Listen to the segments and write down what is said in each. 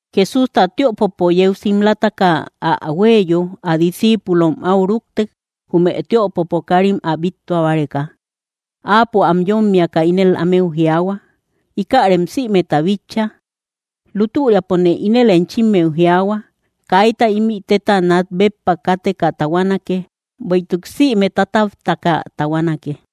Jesústa tiöpopo yeu simlataka ä huéeyo, ä discíipulom áu rúktek, jume tïopopo káarim ä bíttua báreka. Áapo am yómmiaka ínel ámeu jiaahua: —¿Íkärem sïmeta bitcha? Lútüriapone ínel enchimmeu jiaahua, kaita ímï téta nát béppa kateka tahuanake, bueïtuk sïme tátaptaka tahuanake.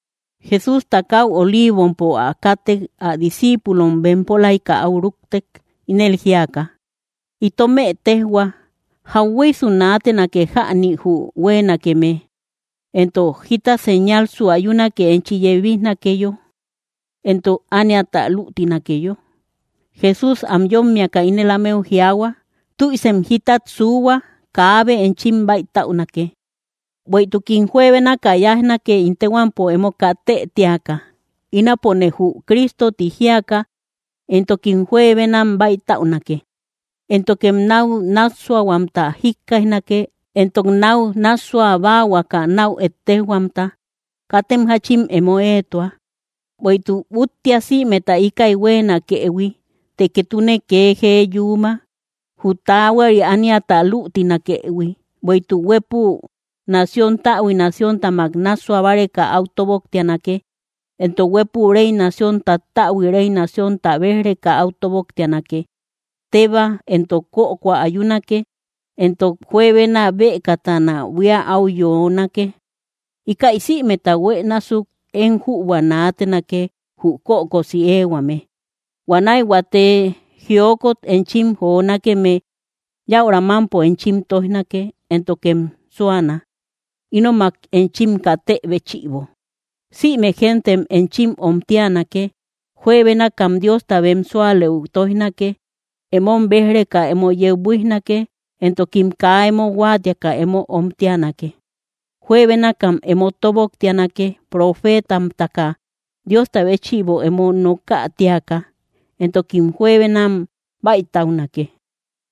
Jesústa káu Oliivompo ä kátek, ä discíipulom bempolaika áu rúktek, ínel jíaka: —Itomë téjhua, ¿jahueysu naatenake jäni jü huéenakeme? Entok, ¿jita señalsu ayunake enchi yebijnakeyo, entok ániata lütinakeyo? Jesús am yómmiaka ínel ámeu jiaahua: —¡Tüisem jítat suuhua! Kaabe enchim bäitäunake, bueïtukim juebénaka yáijnake, ín téhuampo emo katë tíaka: “Ínapone jü Cristo”, ti jíaka; entokim juebenam bäitäunake. Éntokem náu nássuahuamta jikkaijnake, entok náu nássua báahuaka náu ettejhuamta. Katem jáchim emo éetua, bueïtuk úttia sïmeta íkäi huéenakëhui; të ketune kee jee yuuma, jü taahuari ániata lütinakëhui. Bueïtuk huépü nación täbui nacióntamak nássua báreka áu tóboktianake, entok huépü réy nación tattäbui réy naciónta béj‑reka áu tóboktianake. Tébaa entok kökoa ayunake, entok juebena bëkatana buía áu yoonake. Íkäi sïmeta huë násuk, én jübua naatenake, jü kökosi éehuame. ’Huanäi huate jiokot enchim jonakeme, yaura mampo enchim toijnake, éntokem súana, ínomak enchim katë béchïbo, sïme gentem enchim omtianake. Juebénakam Diosta bem súalëu tóijnake. Emom béj‑reka emo yeu buíjnake, entokim kaa emo huáatiaka emo omtianake. Juebénakam emo tóboktianakee profeetamtaka Diosta béchïbo emo nokä tíaka, entokim juebenam bäitäunake.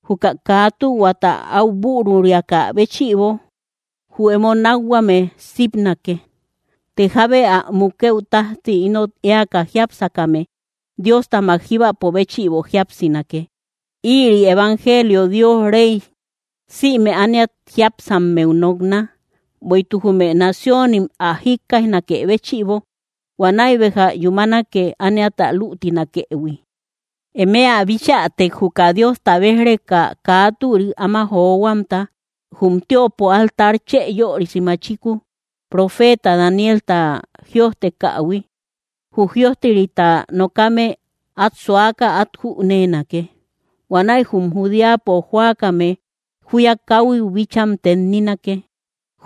Juka kaa tühuata áu büruriakä béchïbo jü emo nákhuame sipnake. pTë jábe ä mukëu tájti ínot éaka jiápsakame, Diostamak jíbapo béchïbo jíapsinake. Ïri evangelio Dios réy, sïme ániat jiápsammeu nokna; bueïtuk jume naciónim ä jikkáijanakë béchïbo. Huanäi béja yúmanake ániata lütinakëhui. ’Eme ä bichätek, juka Diosta béj‑reka kaa türik áma johuamta, jum tiöpo altar chë yörisi machiku, profeta Danielta jïojtekähui —jü jïojterita nokame, át suaka át jüneenake—, huanäi jume Judeapo jóakame júya káhuiu bícham tenninake.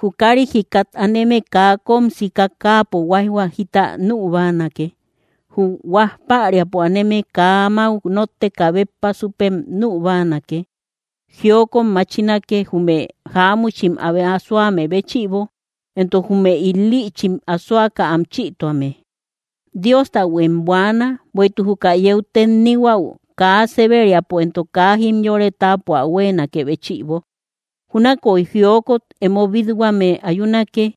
Jü kárit jikat aneme, kaa kóm sika káapo huáijhua jita nü báanake. Jü huaj päriapo aneme, kaa amáu nótteka béppa súpem nü báanake. ¡Jiokot machinake, jume jáamuchim abe asoame béchïbo, entok jume il‑lïchim asoaka am chïtuame! Diostahuem buaana, bueïtuk juka yeu tennihuäu kaa séberiapo entok kaa jimyore táapo ä huénakë béchïbo. Júnakoy jiokot emo bít-huame ayunake.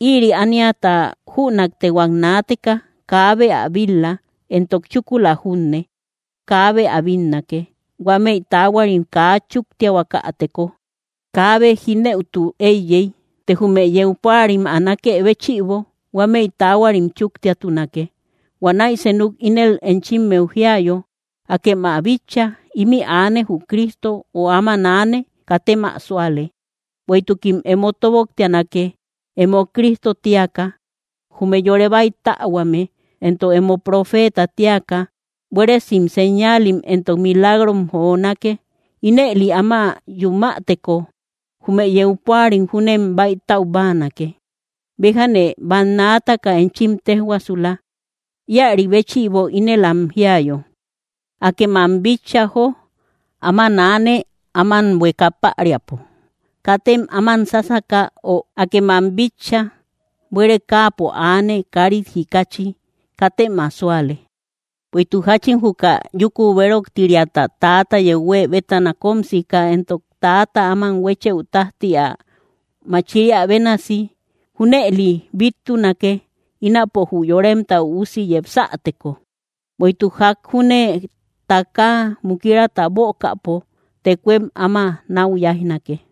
Ïri ániata jünaktehuak naateka, kaabe ä bil-la, entok chúkula junne, kaabe ä bínnake. Huámëi taahuarim kaa chúktiahuakäteko, kaabe jínëutu éiyey; të jume yeu púarim ä nákë béchïbo, huámëi taahuarim chúktiatunake. ’Huanäi senuk ínel enchimmeu jíayo: “¡Akem ä bitcha! Ímï aane jü Cristo”, ö “Áman aane”, katem ä súale. Bueïtukim emo tóboktianake emo Cristo tíaka, jume yore bäitähuame, entok emo profeetam tíaka buéresim señaalim entok milagrom jonake. Ínëli áma yumäteko jume yeu púarim júnem bäitäu báanake. Béjane bannaataka enchim téjhuaasula. Íäri béchïbo, ínel am jíayo: “¡Akem ä bitcha, jó! Áma aane, áman buéeka päriapo”, katem áman sásaka. Ö, “¡Akem ä bitcha! Buére káapo aane, kárit jikachi”, katem ä súale. Bueïtuk jáchin juka yúku béroktiriata täata yeu huë bétana kóm sika entok täata áman huéchëu tájti ä machiriä bénasi, junëline bíttunake, ínapo jü Yoremta Üusi yepsateko. Bueïtuk ják junne takaa mukirata bökäpo, tekuem áma náu yáijnake.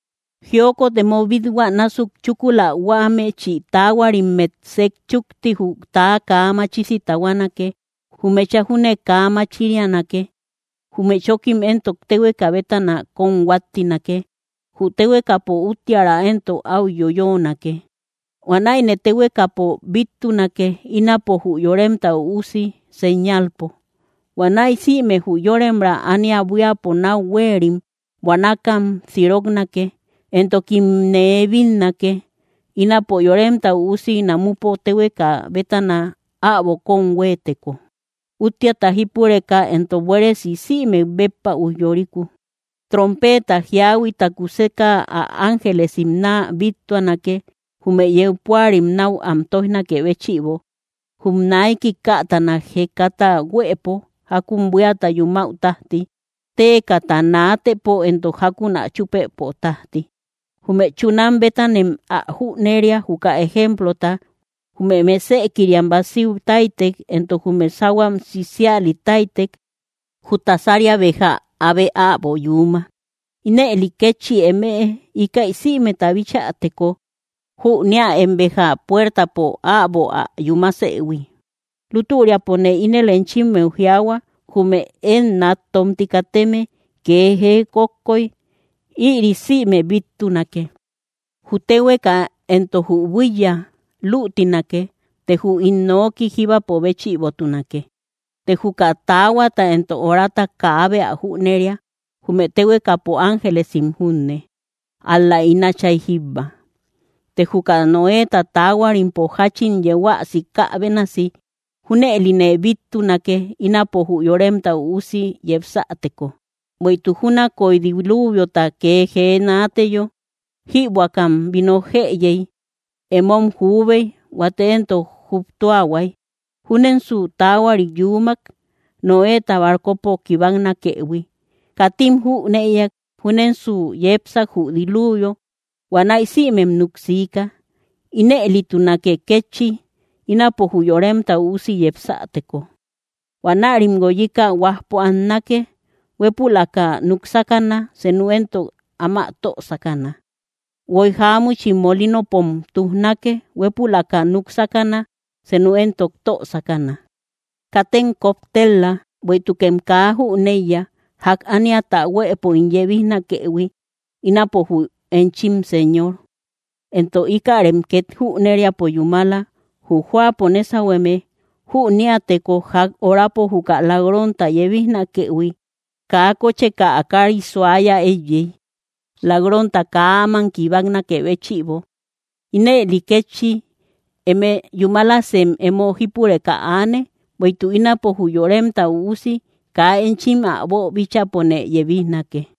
’Jiokot emo bíthuä násuk chúkula huámechi taahuarimmet sejchúkti, jü täa kaa machisi tahuanake; jü mecha júne kaa machirianake; jume chókim entok téhueka bétana kóm huáttinake. Jü téhuekapo úttiära éntok áu yoyoonake. Huanäine téhuekapo bíttunake, ínapo jü Yoremta Üusi señalpo. Huanäi sïme jü yóremra ánia buíapo náu huéerim buanakam siroknake; entokimne bínnake, ínapo Yoremta Üusi namupo téhueka bétana äbo kóm huëteko, úttiata jípureka entok buéresi sïmek béppa ujyoriku. Trompeta jíahuita kuseka ä ángelesim náa bíttuanake, jume yeu púarim náu am tóijnakë béchïbo, jum naiki kätana jekata huëpo, jákun buíata yumäu tájti, téekata naatëpo entok jákun ä chúpëpo tájti. ’Jume chunam bétanem ä jüneria, juka ejemplota, jume mesëkiriam básiu táytek, entok jume sáhuam sisiali táytek, jü tasaria béja abe äbo yuuma. Ínëli kétchi emëe, íkäi sïmeta bichäteko, jüneäem béja puertapo äbo ä yúmasëhui. Lútüripone ínel enchimmeu jiaahua, jume én nat tómti kateme kee jee kókkoy, ïri sïme bíttunake. Jü téhueka entok jü buíya lütinake; të jü ín nooki jíbapo béchïbotunake. ’Të juka taahuata entok orata kaabe ä jüneria, jume téhuekapo ángelesim junne, ál‑la ín Átchay jíbba. ’Të juka Noéta taahuarimpo jáchin yeu ä sikä bénasi, junëline bíttunake, ínapo jü Yoremta Üusi yepsäteko. Bueïtuk júnakoy diluviota kee jee naateyo, jïbuäkam vino jëyey, emom juubey, huate entok juptuahuay; júnensu taahuari yuumak, Noéta barcopo kibaknakëhui. Katim jünëiak, júnensu yepsak jü diluvio huanäi sïmem nuksika, inëlitunake kétchi, ínapo jü Yoremta Üusi yepsäteko. Huanärim guoyika huajpo annake; huépülaka núk sákana, senu éntok áma tö sákana. Guoy jáamuchim molinopom tujnake; huépülaka núk sakana, senu éntok tö sákana. ’Katem koptel‑la, bueïtukem kaa jüneiya, ják ániata huëpo ín yebijnakëhui, ínapo jü enchim Señor. Entok íkärem két jüneriapo yúmala: jü jóapo nésahueme jüniäteko ják orapo juka lak‑ronta yebijnakëhui, kaa kócheka ä kaari suaya éiyey, lak‑ronta kaa áman kibaknakë béchïbo. Ínëli kétchi, eme yúmalasem emo jípureka aane; bueïtuk ínapo jü Yoremta Üusi kaa enchim ä boobíchäpone yebijnake.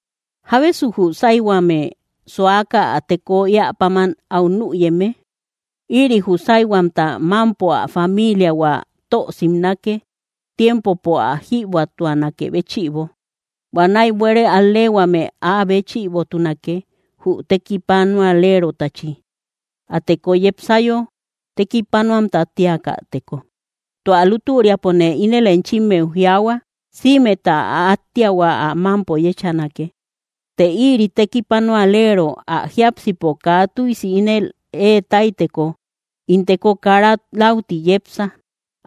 ’¿Jábesu jü sáyhuame suaka ä teko éä páman áu nüyeme? Ïri jü sáyhuamta mámpo ä famiiliahua tö simnake, tiempopo ä jïbuätuanakë béchïbo. Huanäi buére al‑leehuame áa béchïbotunake, jü tekipanualerotachi, ä teko yepsayo tekipanuamta tíakäteko. Tua lútüriapone ínel enchimmeu jiaahua, sïmeta ä áttiahua ä mámpo yéchanake. Të ïri tekipanualero ä jiápsipo kaa tüisi ínel ée táyteko: “In teko kara läuti yepsa”,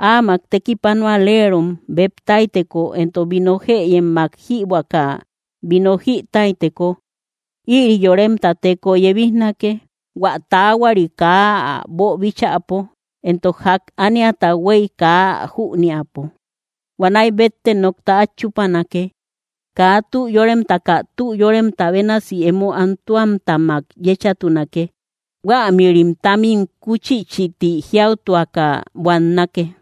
áamak tekipanualerom béb táyteko entok vino jëyemmak jïbuäka vino jï táyteko, ïri yoremta teko yebijnake, hua taahuari kaa ä boobíchäpo, entok ják ániata huéy kaa ä jüneäpo. Huanäi bétte nokta át chúpanake. Kaa tü yóremtaka tü yóremta bénasi emo antuammak yéchatunake; huämïrim támim kuchichïti jiautuaka buannake.